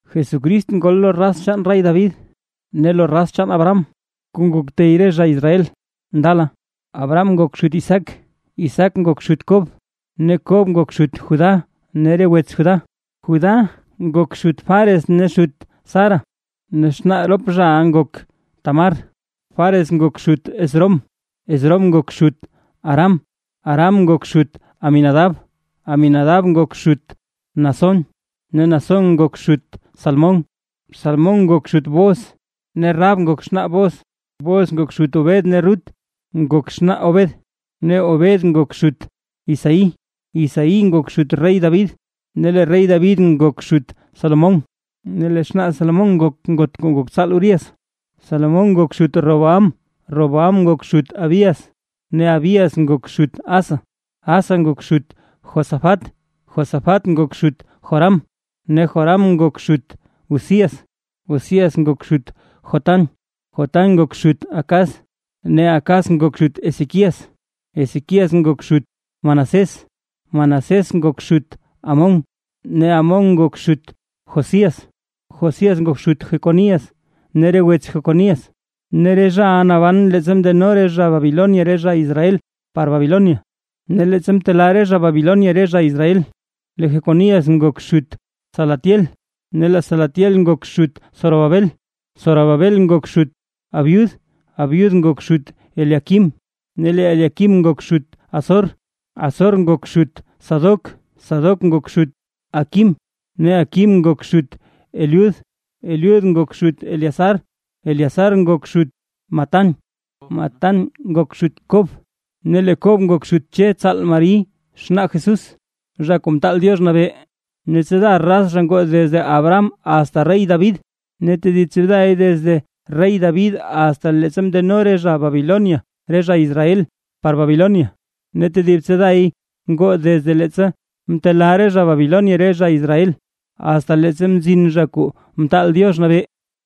Jesucrist ngol lo raz chaan rey David, ne lo raz chaan Abraham kuu ngok tey re zha Israel ndala. Abraham ngok xut Isaac, Isaac ngok xut Kob, ne Kob ngok xut Judá ne re wets Judá. Judá ngok xut Fares ne xut Zara, ne xnaa rop zhaʼa ngok Tamar, Fares ngok xut Esrom, Esrom ngok xut Aram. Aram ngok xut Aminadab, Aminadab ngok xut Naasón, ne Naasón ngok xut Salmón. Salmón ngok xut Booz ne Rahab ngok xnaa Booz, Booz ngok xut Obed ne Rut ngok xnaa Obed, ne Obed ngok xut Isaí. Isaí ngok xut rey David, ne lee rey David ngok xut Salomón, ne lee xnaa Salomón ngok ngot kuu ngok tsaal Urías. Salomón ngok xut Roboam, Roboam ngok xut Abías, ne Abías ngok xut Asa. Asa ngok xut Josafat, Josafat ngok xut Joram, ne Joram ngok xut Uzías. Uzías ngok xut Jotam, Jotam ngok xut Acaz, ne Acaz ngok xut Ezequías. Ezequías ngok xut Manasés, Manasés ngok xut Amón, ne Amón ngok xut Josías. Josías ngok xut Jeconías ne re wets Jeconías, ne re zhaʼa naban leettsa mndeno re zha Babilonia re zha Israel par Babilonia. Ne leettsa mtelaa re zha Babilonia re zha Israel; lee Jeconías ngok xut Salatiel, ne lee Salatiel ngok xut Zorobabel. Zorobabel ngok xut Abiud, Abiud ngok xut Eliaquim, ne Eliaquim ngok xut Azor. Azor ngok xut Sadoc, Sadoc ngok xut Aquim, ne Aquim ngok xut Eliud. Eliud ngok xut Eleazar, Eleazar ngok xut Matán, Matán ngok xut Kob; ne lee Kob ngok xut Che tsaal Mari xnaa Jesús, Zha Kuu Mtaal Diox Nabee. Ne tsiida raz ngoo desde Abraham asta rey David, ne tedib tsiiday desde rey David asta leettsa mndeno re zha Babilonia re zha Israel par Babilonia, ne tedib tsiiday ngoo desde leettsa mtelaa re zha Babilonia re zha Israel, asta leettsa mzin Zha Kuu Mtaal Diox Nabee.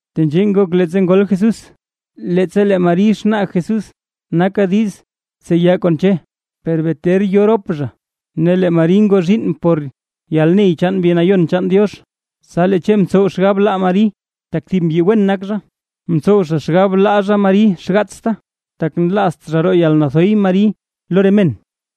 Tenzhee ngok leettsa ngol Jesús: Leettsa lee Mari xnaa Jesús naka diiz tseya kon Che, per bee ter yo rop zha, ne lee Mari ngoo zhiinn por yalney chaan Mbi Nayon chaan Diox. Tsa lee Che mtsow xgab laa Mari, tak thib mbyi wen nak zha, mtsow zha xgab laa zha Mari xgaatsta, tak nlaazt zha roo yalnathoy Mari lo re men.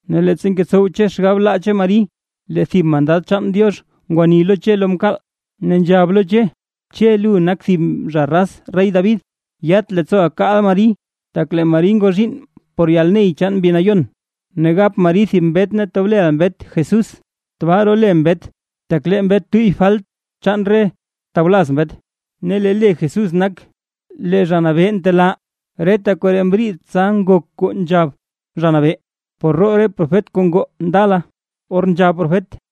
Ne leettsa ngetsow Che xgab laa Che Mari, lee thib mandad chaan Diox cha ngwani lo Che lo mkaal, ne nzhab lo Che: ―Che, lu nak thib zha raz rey David, yat leettsooʼa kaaʼa Mari, tak lee Mari ngoo zhiinn por yalney chaan Mbi Nayon, ne gap Mari thib mbet ne tob leʼa mbet Jesús. Tbaa role mbet tak lee mbet tuyy falt chaan re tawlaz mbet. Ne lee le Jesús nak: Lee Zha Nabee ntelaa. Reta koree mriid tsa ngok kuu nzhab Zha Nabee, por roo profet kuu ngoo ndala, or nzhab profet: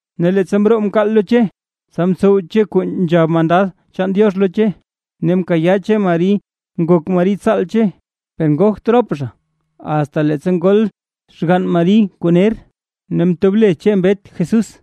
Ne leettsa mroo mkaal lo Che, tsa mtsow Che kuu nzhab mandad chaan Diox lo Che, ne mkayaa Che Mari ngok Mari tsaal Che. Per ngogt rop zha, asta leettsa ngol xgann Mari kuu ner; ne mtob le Che mbet Jesús.